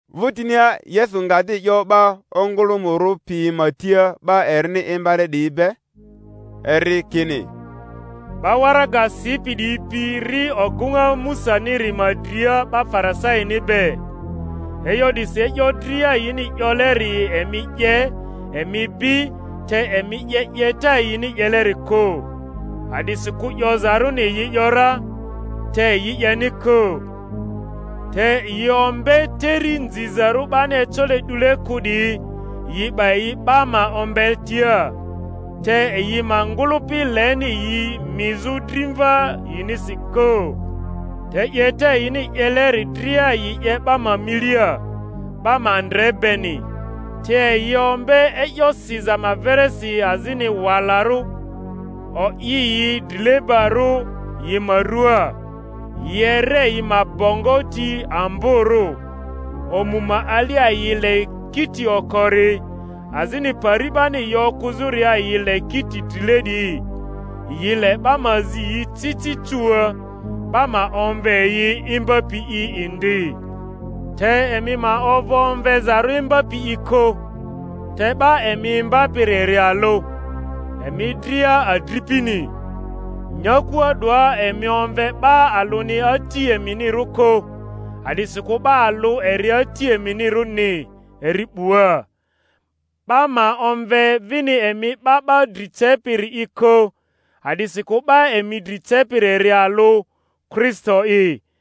Vᴜtinia Yesu nga di 'yo 'ba ongᴜlᴜmᴜrᴜ piyi ma tia 'ba erini imbale 'diyi be, eri kini, 'Ba waraga sipi 'diyi pi ri ogᴜŋa Musaniri ma dria 'ba Farisaini be; e'yo 'disi e'yo dria yini 'yoleri emi 'ye, emi bi, te emi 'ye 'yeta yini 'yelerile kᴜ; a'disikᴜ 'yozarᴜni yi ‘yora, te yi 'yeni kᴜ. Te yi ombe teri nzizarᴜ 'bani ecole 'dule kᴜ 'diyi, yi 'ba yi 'ba ma ombetia; te yi ma ngᴜlᴜpi leni yi mizᴜ drimva yinisi kᴜ. Te 'yeta yini 'yeleri dria yi 'ye 'ba ma milia, 'ba ma ndre beni; te yi ombe e'yo siza ma verisi azini walarᴜ, o'i yi drilebarᴜ yi ma ruaa, yi ere yi ma bongo ti amborᴜ, omu ma alia yi le kiti okori, azini pari 'bani yi okᴜzᴜria yi le kiti drile 'diyi, yi le 'ba ma zi yi ci ci cuua, 'ba ma omve yi Imbapi'i indi. Te emi ma ovᴜ omvezarᴜ Imbapi'i kᴜ, te 'ba emi imbapiri eri alᴜ, emi dria adripini. Nyakua 'doa emi omve 'ba alᴜni ati eminirᴜ kᴜ, a'disikᴜ 'ba alᴜ eri Ati eminirᴜni, eri 'bua. 'Ba ma omve vini emi 'ba 'ba dri cepiri'i kᴜ, a'disikᴜ 'ba emi dri cepiri eri alᴜ, Kristo'i.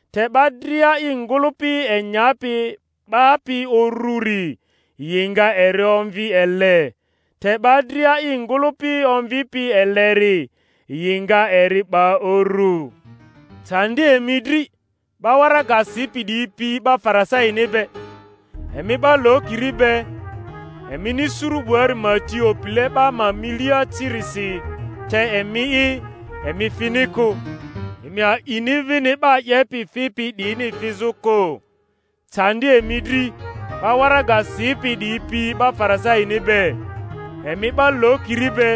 te 'ba dria i ngᴜlᴜpi enyapi 'bapi ururi yi nga eri omvi ele, te 'ba dria i ngᴜlᴜpi omvipi eleri yi nga eri 'ba uru. Candi emi dri, 'ba waraga sipi 'diyi pi 'ba Farisaini be, emi 'ba lokiri be! emini suru 'buari ma ti opile 'ba ma milia cirisi; te emi'i, emi fini kᴜ, emi a'ini vini 'ba 'yepi fipi 'diyini fizᴜ kᴜ. Candi emi dri, 'ba waraga sipi 'diyi pi 'ba Farisaini be, emi 'ba lokiri be!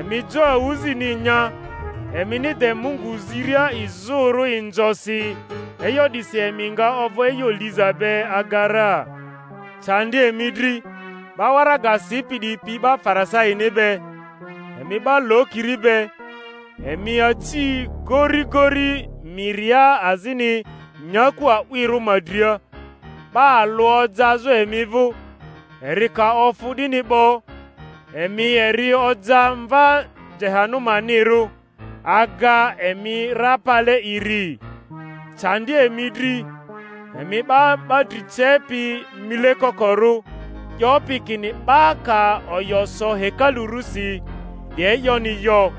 emi jo awᴜzini nya, emini de Mungu ziria izᴜrᴜ inzosi; e'yo 'disi emi nga ovᴜ e'yo liza be aga ra. Candi emi dri, 'ba waraga sipi 'diyi pi 'ba Farisaini be, emi 'ba lokiri be! emi aci gorigori miria azini nyaku a'wirᴜ ma dria, 'ba alᴜ ojazᴜ emi vᴜ; eri ka ofᴜ 'dini 'bo, emi eri oja mva Jehanumanirᴜ aga emi ra pale iri. Candi emi dri, emi 'ba 'ba dri cepi mile kokorᴜ, 'yopi kini, 'Ba ka oyo so hekalu rusi, 'di e'yoni yo;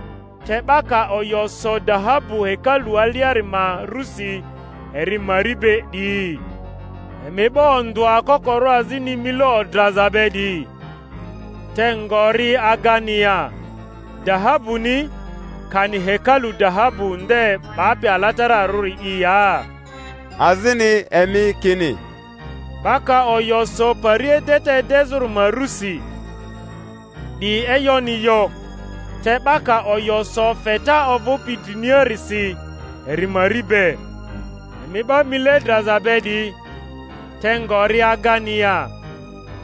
te 'ba ka oyo so dahabu hekalu aliari ma rᴜsi, eri mari be, 'diyi. Emi 'ba ondᴜa kokorᴜ azini mile odraza be 'diyi! Te ngori agani ya, dahabuni, kani hekalu dahabu nde 'bapi alatararᴜri'i ya? Azini emi kini, 'Ba ka oyo so pari edeta edezᴜri ma rᴜsi, 'di e'yoni yo; te 'ba ka oyo so feta ovupi driniarisi, eri mari be. Emi 'ba mile draza be 'diyi! Te ngori agani ya,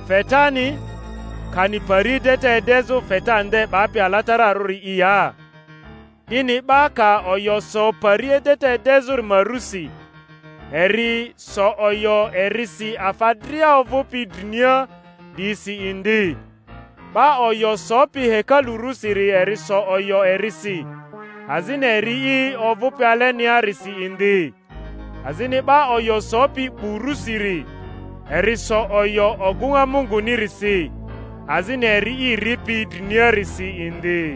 fetani, kani pari edeta edezᴜ feta nde 'bapi alatararuri'i ya? 'Dini 'ba ka oyo so pari edeta edezᴜri ma rusi, eri so oyo erisi afa dria ovᴜpi drmia 'diyisi indi; 'ba oyo sopi hekalu rᴜsiri eri so oyo erisi, azini Eri'i ovᴜpi aleniarisi indi. Azini 'ba oyo sopi 'bu rusiri, eri so oyo ogᴜŋa Mungunirisi, azini Eri'i ripi driniarisi indi.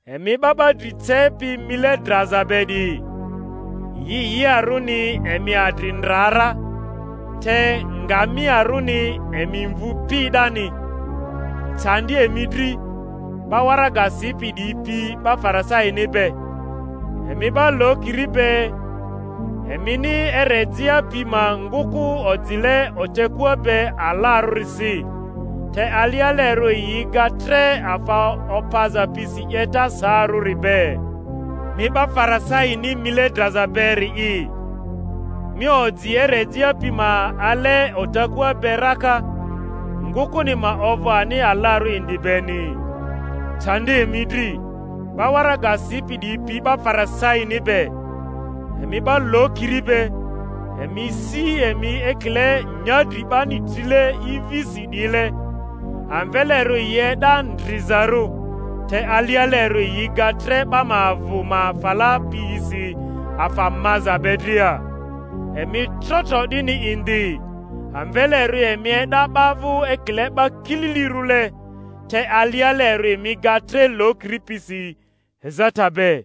Emi 'ba 'ba dri cepi mile draza be 'diyi! Yiyiarᴜni emi adri ndra ra, te ngamiarᴜni emi mvu pi 'dani! Candi emi dri, 'ba waraga sipi 'diyi pi 'ba Farisaini be, emi 'ba lokiri be! emini erejea pi ma ngᴜkᴜ ojile otekua be alarᴜrisi, te alialerᴜ yi ga tre afa opaza pisi 'yeta saarᴜri be. Mi 'ba Farisaini mile draza beri'i! mi oji erejea pi ma ale otekua be raka, ngᴜkᴜni ma ovᴜ ani alarᴜ indi beni. Candi emi dri, 'ba waraga sipi 'diyi pi 'ba Farisaini be, emi 'ba lokiri be! emi si emi ekile nyadri 'bani trile ivisi 'diyile, amvelerᴜ yi e'da ndrizarᴜ, te alialerᴜ yi ga tre 'ba ma avᴜ ma fala piyisi afa maza be dria. Emi tro tro 'dini indi, amvelerᴜ emi e'da 'ba vᴜ ekile 'ba kililirᴜle, te alialerᴜ emi ga tre lokiri pisi ezata be.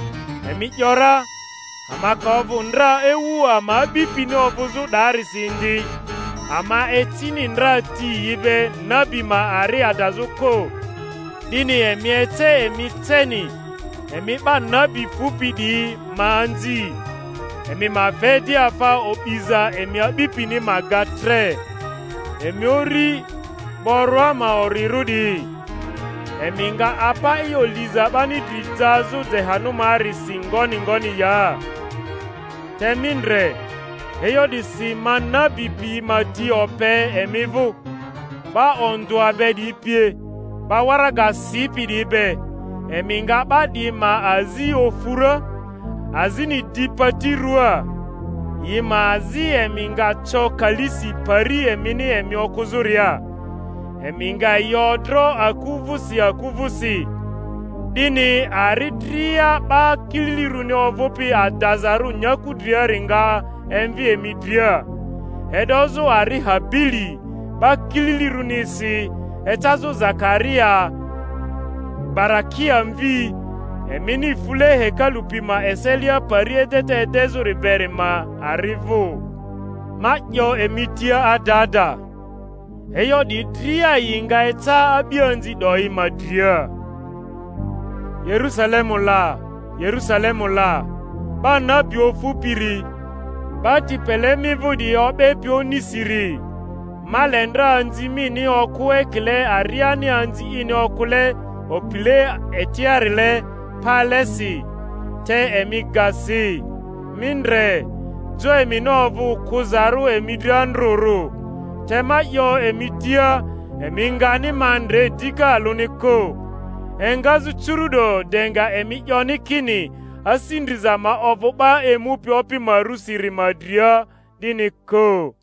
emi ‘yora, Ama ka ovᴜ ndra ewu ama a'bipini ovᴜzᴜ 'dayisi indi, ama ecini ndra ti yi be nabi ma ari adazᴜ kᴜ. 'Dini emi ece emi ceni, emi 'ba nabi fupi 'diyi ma anzi. Emi ma fe di afa o'biza emi a'bipini ma ga tre! Emi uri, boroa ma orirᴜ 'diyi, emi nga apa e'yo liza 'bani dri jazᴜ Jehanumaarisi ngoni ngoni ya? Te mi ndre, e'yo 'disi ma nabi piyi ma ti ope emi vᴜ, 'ba ondᴜa be 'diyi pie, 'ba waraga sipi diyi be; emi nga 'ba 'diyi ma azi ofu ra, azini di pati ruaa, yi ma azi emi nga co kalisi pari emini emi okᴜzᴜria, emi nga yi odro aku vᴜsi aku vᴜsi; 'dini ari dria 'ba kililirᴜni ovᴜpi adazarᴜ nyaku driari nga emvi emi dria, e'dozᴜ ari Habili 'ba kililirᴜrinisi ecazᴜ Zakaria Barakia mvi, emini fule hekalu pi ma eselia pari edeta edezᴜri beri ma ari vᴜ. Ma 'yo emi tia ada ada, e'yo 'diyi dria yi nga eca a'bianzi 'doyi ma dria. Yerusalemu la! Yerusalemu la! 'ba nabi ofupiri, 'ba ti pele mi vᴜ 'diyi o'bepi onisiri! Ma le ndra anzi mini okᴜ ekile ariani anzi ini okᴜle opile etiarile pale si, te emi ga si! Mi ndre, jo emini ovᴜ kᴜzarᴜ emi dri andrᴜrᴜ. Te ma 'yo emi tia, Emi ngani ma ndre dika alᴜni kᴜ, engazᴜ curu’do de nga emi 'yoni kini, Asi ndriza ma ovᴜ 'ba emupi Opi ma rᴜsiri ma dria, 'dini kᴜ.